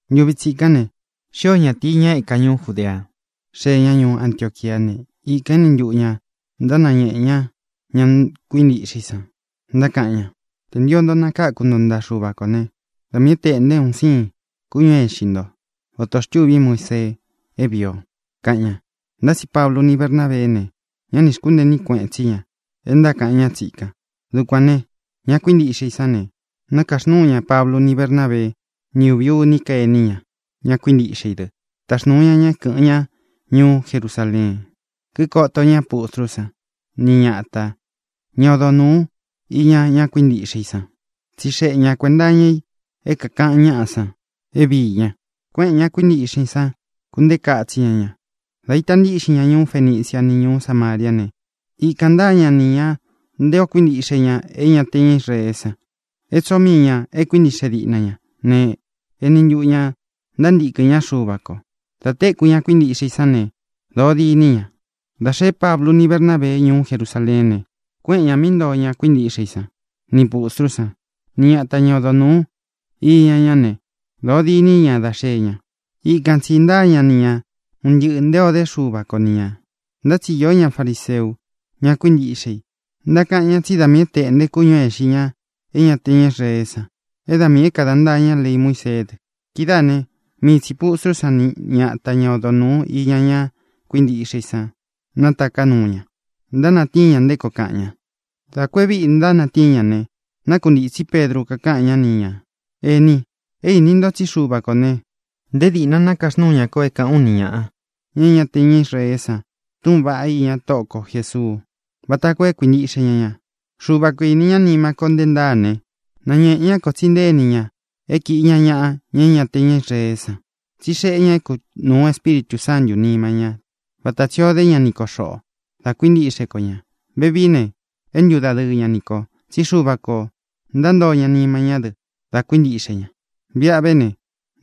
Ntuvi tsikán ne, xío ñatīi, ña e éka ñuú Judea, xee ña ñuú Antioquiá ne, ikān éni ntuꞌu ñā ntánañēꞌe ña ña kuíntiꞌxe i san, ntákaꞌan ña: —Tē ntio nto nakáku nto ntaꞌa Xuva kō né, da miī é tēꞌnte un siin kúñū é ixi nto, vata ō xtúvi Muísee é vīi o —kaꞌan ña. Ntá tsi Pablu ni Bernábeé ne, ñá nī xkúntee iní kueꞌen tsí ña é ntákaꞌan ñá tsikan. Dukuān ne, ña kuíntiꞌxe i sán ne, nakaxnúu ña Pablu, ni Bernábeé, ni uvi uní ka ení ña, ña kuíntiꞌxe i dɨ, táxnūu ña ña é kɨ̄ꞌɨn ñá ñuú Jerusaleen, kíkoto ña pustrú san, ni ñata, ña odo nūú iña ña kuíntiꞌxe i san, tsíxeꞌe ña kuēnta iña i é kākaꞌan ñáꞌa san é viī ña. Kuéꞌēn ña kuíntiꞌxe i san, kuntéka itsi ña ña. Dā ita ntíꞌxin ña ñuú Fenicia ni ñuú Samariá ne, ikān ntáa ña ni ñā nté ō kuíntiꞌxe ña é ña te ña Israeé san, é tsoo mii ñā e kuíntiꞌxe diꞌna ña ne, eni ntuꞌu ñā ntántīkɨn ñá Xuva kō. Dā téku ña kuíntiꞌxe i sán ne, dōo dîní ña. Dā xeé Pablu ni Bernábee ñuú Jerusaleén ne, kuéꞌen ñā mí ntoo ña kuíntiꞌxe i san, nī pustrú san, ni ñata, ña odo nūú iña ñá ne, dōo diní ña dá xee ña. Ikan tsī ntáa ña ni ña un ntɨꞌɨ̄ nté ō dé Xuva ko ni ñā. Ntá tsi īó ña fariseu, ña kuíntiꞌxe i, ntákaꞌan ña tsí da miī é tēꞌnté kúñū é īxi ña é ña te ña Israeé san, é da miī é kāda ntaa ña lei Muíseé dɨ. Kidáā né, mii tsī pustrú san ni ñata, ña odo nūú iña ña kuíntiꞌxe i san, nátaká nuu ña, ntánatíin ña nté koo kaꞌan ña. Dā ku e víꞌi ntánatíin ña ne, nákuntītsí Pedru, kakaꞌan ñá ni ñā: —Ení, é īni nto tsí Xuva kō ne, nté dīꞌna nakaxnúu ña ko é kāꞌán u ni ñāꞌa, ña é ña te ña Israeé san, túꞌūn vaꞌá iña Tóꞌo ko Jēsuu vata koo é kuīntiꞌxe ña ña. Xuva kō ini ñá nima ko nté ntaa ne, náñēꞌe ñá kō tsí intée ini ña é kīꞌi ña ñaꞌa, ña é ña te ña Israeé san, tsí xeꞌé ña é kunūu Espíritū Sántū nima ñá vata tsī o dé ña ni ko xoꞌō dá kuintiꞌxe ko ñā. Vevií ne, é ntudadɨɨ ña ni kō, tsí Xuva kō ntántoo ña nima ñá dɨ dā kuíntiꞌxe ña. Viꞌa ve ne,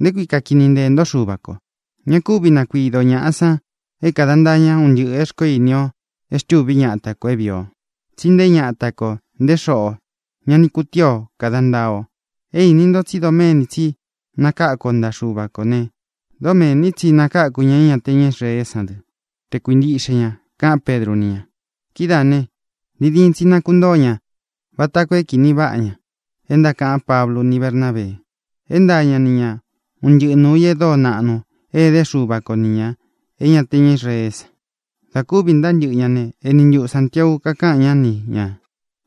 ¿nté kui kakini nteē ntó Xuva kō? Ña kúvi nakuido ō ñaꞌa san é kada ntaa ña un ntɨꞌɨ̄ e xkoó ini o e xtûví ñata kō é vīi o. Tsí nté ñata kō, nté xoꞌō, ñá ni kūtíi o kāda ntaa o. É īni nto tsí doméni tsi nakáku o ntaꞌa Xuva kō ne, dómēni tsi nakaku ña é ña te ña Israeé san dɨ́ tē kuíntiꞌxe ña —kaꞌán Pedru ni ña. Kidáā ne, diin diin tsi nakuntoo ña vata koo é kīni váꞌa ña é ntákaꞌan Pablu ni Bernábee, é ntaa ña ni ña un ntɨꞌɨ nuū i e dóo naꞌnu é edé Xuva ko nī ña é ña te ña Israeé san. Dā kúvi ntáa ntɨꞌɨ ña ne, eni ntuꞌu Sāntiau kakáꞌan ñá ni ñā: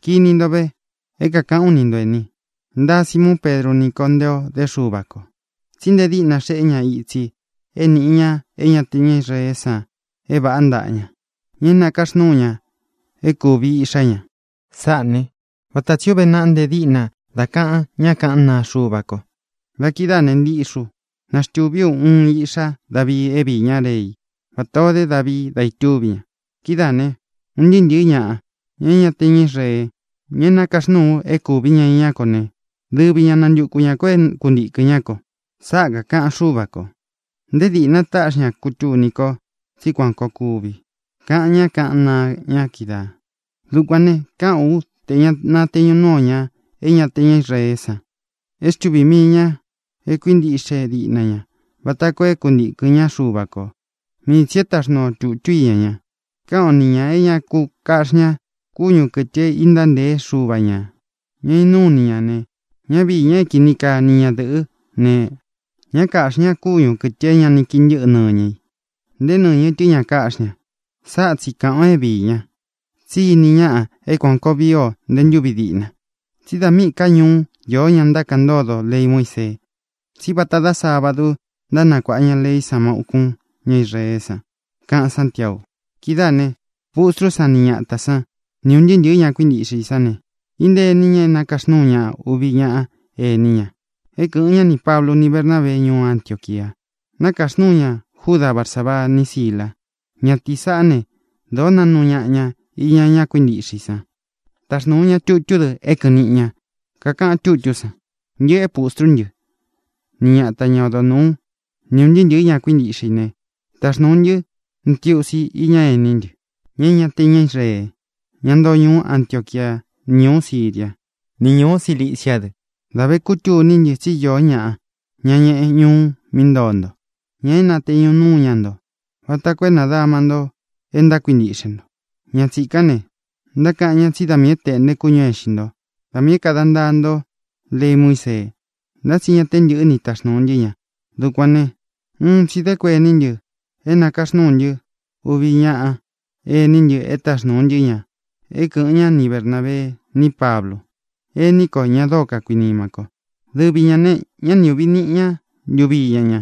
—Kini nto ve é kākaꞌán u ni nto, ēni: Ntāa Simuun Pedru ní kō nte o dé Xuva kō. Tsi nté dīꞌna xeꞌé ña itsi é niꞌi ña é ña te ña Israeé san é vāꞌá ntaꞌa ña, ña é nākaxnúu ña é kuvi iꞌxá ña. Sáꞌā né, vata tsī ó uve naꞌa nte díꞌna dá kaꞌan ñá kaꞌán naa Xuva ko: Da kidáā ne, ntiꞌxi ú, naxtūví u uun iꞌxá Davii é viī ñá rei vata o dé Davii da itúvi ña. Kidáā ne, un ntɨɨ́ ntɨ̄ɨ́ ñaꞌa, ña é ña te ña Israee, ña é nakaxnúū ú é kūvi ña iñá ko ne, dɨvi ñā nantúku ñā kó é kuntīkɨn ñá ko. Sáꞌa kākaꞌan Xúva kō; nté dīꞌna táꞌxi ña kútūní ko tsí kuan kōo kuvi, kaꞌan ñá kaꞌán naa ña kídaā. ʼDukuān ne, káꞌān ú tē ña nateñu núu ō ña é ña te ña Israeé san e xtúvī mii ña é kuintiꞌxe diꞌna ña vata koo é kuntīkɨn ñá Xuva kō. Mii tsī é taxnuu o tūtú iña ña, káꞌan o ni ñā é ñá ku kāꞌxi ñá kúñū kɨtɨ é intáa ntēé xuva ñā, ña inúu ini ñā ne, ña vii ña é kini kaa ni ñadɨ̄ꞌɨ́ ne, ñá kāꞌxi ñá kúñū kɨtɨ é ña ni kii ntɨ́ꞌɨ nɨñɨ i, nté nɨñɨ́ tɨ ña káꞌxi ña. Sáꞌa tsi kāꞌán ō é viī ña. Tsí ini ñaꞌa é kuān koo vii o nté ntūvi diꞌna. Tsí dā míꞌi ka ñuú iō ñá ntákaꞌan ntódo lei Muísee, tsí vata dá sábadu ntánakuāꞌa ña leí san má ūkún ña Israeé san —kaꞌan Sántiau. Kidáā ne, pustrú san ni ñatā sán, ni ūn ntɨɨ́ ntɨ̄ɨ́ ñá kuíntiꞌxe i sán ne, íntēe iní ña é nakaxnūu ña uvi ñaꞌa ení ña é kɨꞌɨ̄n ñá nī Pablu ni Bernábee ñuú Antioquia. Nakaxnúu ña Juda Barsabaa ni Sílā. Ñatīí saꞌá ne, dōó naꞌnu ñaꞌa ña iña ña kuíntiꞌxe i san. Táxnūu ña tutú dɨ é kɨ̄ꞌɨn niꞌi ña. Kakaꞌan tutú san: “Ntɨꞌɨ é pustrú ntɨ, ni ñata, ña odo nūú, ni ūn ntɨɨ́ ntɨ̄ɨ́ ñá kuíntiꞌxe i ne, taxnūu ntɨ́ ntiusi iña ení ntɨ, ña é ña te ña Israee, ña ntoo ñuú Antioquia, ni ñūú Siria, ni ñūú Cilicia dɨ. Dā vé kutuní ntɨ tsi íō ñaꞌa, ña ñeꞌe ñuú mí ntoo nto, ña é nāteñu núu ña nto vata koo é nādama nto é ntákuintiꞌxe nto. Ña tsīkán ne, ntákaꞌan ña tsí da miī é tēꞌnte kúñū é ixi ntó, da miī é kāda ntaa nto lei Muísee. Ntá tsi ña te ntɨ́ꞌɨ ní taxnūu ntɨ́ ña. Dukuān né, un tsi dē kuení ntɨ é nākaxnúu ntɨ́ uvi ñaꞌa ení ntɨ é taxnūu ntɨ́ ña é kɨꞌɨn ña ni Bernābee ní Pablu, ení kō, ña dóo kakuinima ko. Dɨvi ñā ne, ñá ni uꞌvī niꞌi ña ntuvi íña ña,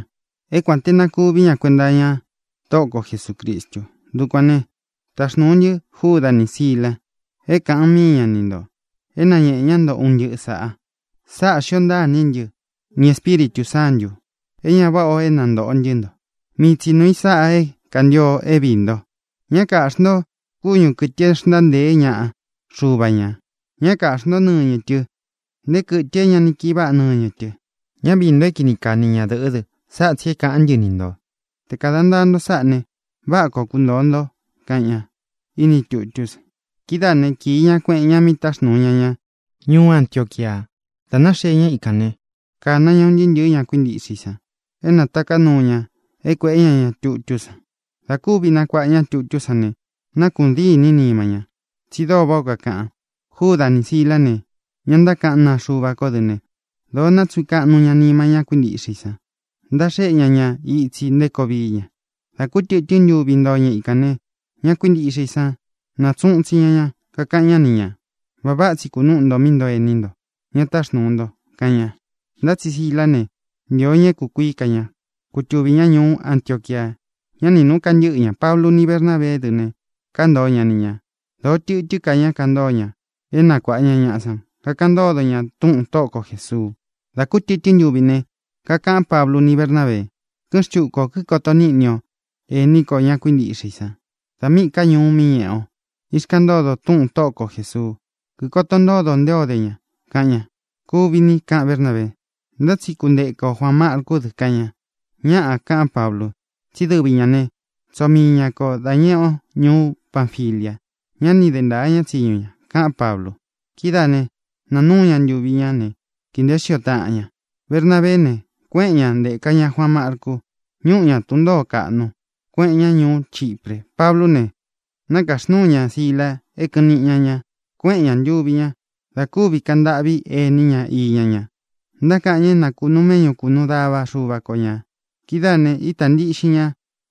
é kuān te na kuví ña kuenta iña Tóꞌo ko Jesūcristu. Dukuān ne, táxnūu ntɨ́ Júda nī Sílā, é kāꞌan míi ña ni ntō, é nañēꞌe ñá nto un ntɨꞌɨ sāꞌa. Sáꞌā xío ntaa iní ntɨ nī Espíritū Sántū, é ña váꞌa ō é nantōꞌo ntɨ́ nto. Mii tsi nuū i sáꞌa é kantio é viī nto: Ña káꞌxi nto kúñū kɨtɨ e xntáa ntēé ñaꞌa xuva ñā; ñá kaꞌxī ntó nɨñɨ tɨ, nté kɨtɨ é ña ni kii váꞌa nɨñɨ tɨ. Ñá viī nto é kini kaa ni ñadɨ̄ꞌɨ́ dɨ. Sáꞌa tsī é kāꞌán ntɨ ni ntō: Te kāda ntaa nto sáꞌa ne, váꞌa koo kuntōo nto”, kaꞌan ñá ini tutú san. Kidáā né, kīi ña, kueꞌen ña mí táxnūu ña ña ñuú Antioquia. Dā náxee ñá ikān né, kāna ña un ntɨɨ́ ntɨ̄ɨ́ ña kuíntiꞌxe i san é na nātaká nuu ña é kuēꞌé ña ña tutú san. Dā kúvi nakuaꞌa ña tutú san ne, nákuꞌun dîní nima ñá, tsi dóo váꞌā ó kakaꞌan. Júda nī Sílā ne, ña ntákaꞌán naa Xuva ko dɨ́ ne, dōo nátsuꞌun kaꞌnu ña nima ñá kuíntiꞌxe i san, ntaxéꞌe ña ña itsi nté koo vií ña. Dā kú tɨtɨ́n ntuvi ntoo ña ikān ne, ña kuíntiꞌxe i san nátsuꞌun itsi ña ña, kakaꞌan ñá ni ñā: —Vaꞌa váꞌa tsi kunúꞌu nto mí ntoo ení nto, ña táxnūu nto —kaꞌan ña. Ntá tsi Sílā né, ntīo ña é kūkuií ka ña, kutuvī ñá ñuú Antioquia. Ñá ni nūꞌu kantɨ́ꞌɨ ña. Pablu ni Bernábeé dɨ ne, kántoo ña ni ñā. Dōo tɨtɨ́n ka ña kantóo ña é nakuāꞌa ña ñaꞌa san, kakaꞌan ntódo ña túꞌūn Tóꞌo ko Jēsuu. Dā kú tɨtɨ́n ntuvi ne, kakaꞌan Páblu ni Bernábee: —Kɨ́ꞌɨn xtuku ō, kikoto níꞌni o ení kō, ña kuíntiꞌxe i san, da míꞌī ká ñuu mí ñeꞌe o, íxkaꞌan ntódo ō túꞌūn Tóꞌo ko Jēsuu. Kikoto ntódo ō nté o de ña —kaꞌan ña. —Kuvi ni —kaꞌan Bernábee—. Ntá tsi kunteka ō Juaan Marcú dɨ —kaꞌan ña. —Ñáꞌā —kaꞌán Pablu—. Tsí dɨvi ñā né, tsoo mii ña kō dá ñeꞌe o ñuú Panfilia. Ñá ni de ntaā ñá tsiñu ña —kaꞌán Pablu. Kidáā ne, naa núu ña ntuvi ñá ne, kīi nteé xio táꞌan ña. Bernabeé ne, kuéꞌen ña, ntēka ñá Juaan Marcu. Ñuꞌu ña tun ntōó kaꞌnu, kuéꞌen ña ñuú Chipre. Pablú ne, nākáxnúu ña Sílā é kɨ̄ꞌɨn niꞌi ña ña. Kuéꞌen ñā, ntuvi ña, da kúvi kaꞌan ntâꞌví ení ña iña ña. Ntákaꞌan ña é na kūnuu méꞌñu, kūnuu dava Xuva ko ña. Kidáā ne, ítā ntiꞌxin ña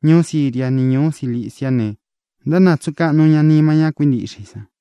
ñuú Siria ni ñūú Ciliciá ne, ntánatsuꞌun kaꞌnu ña nima ñá kuíntiꞌxe i san.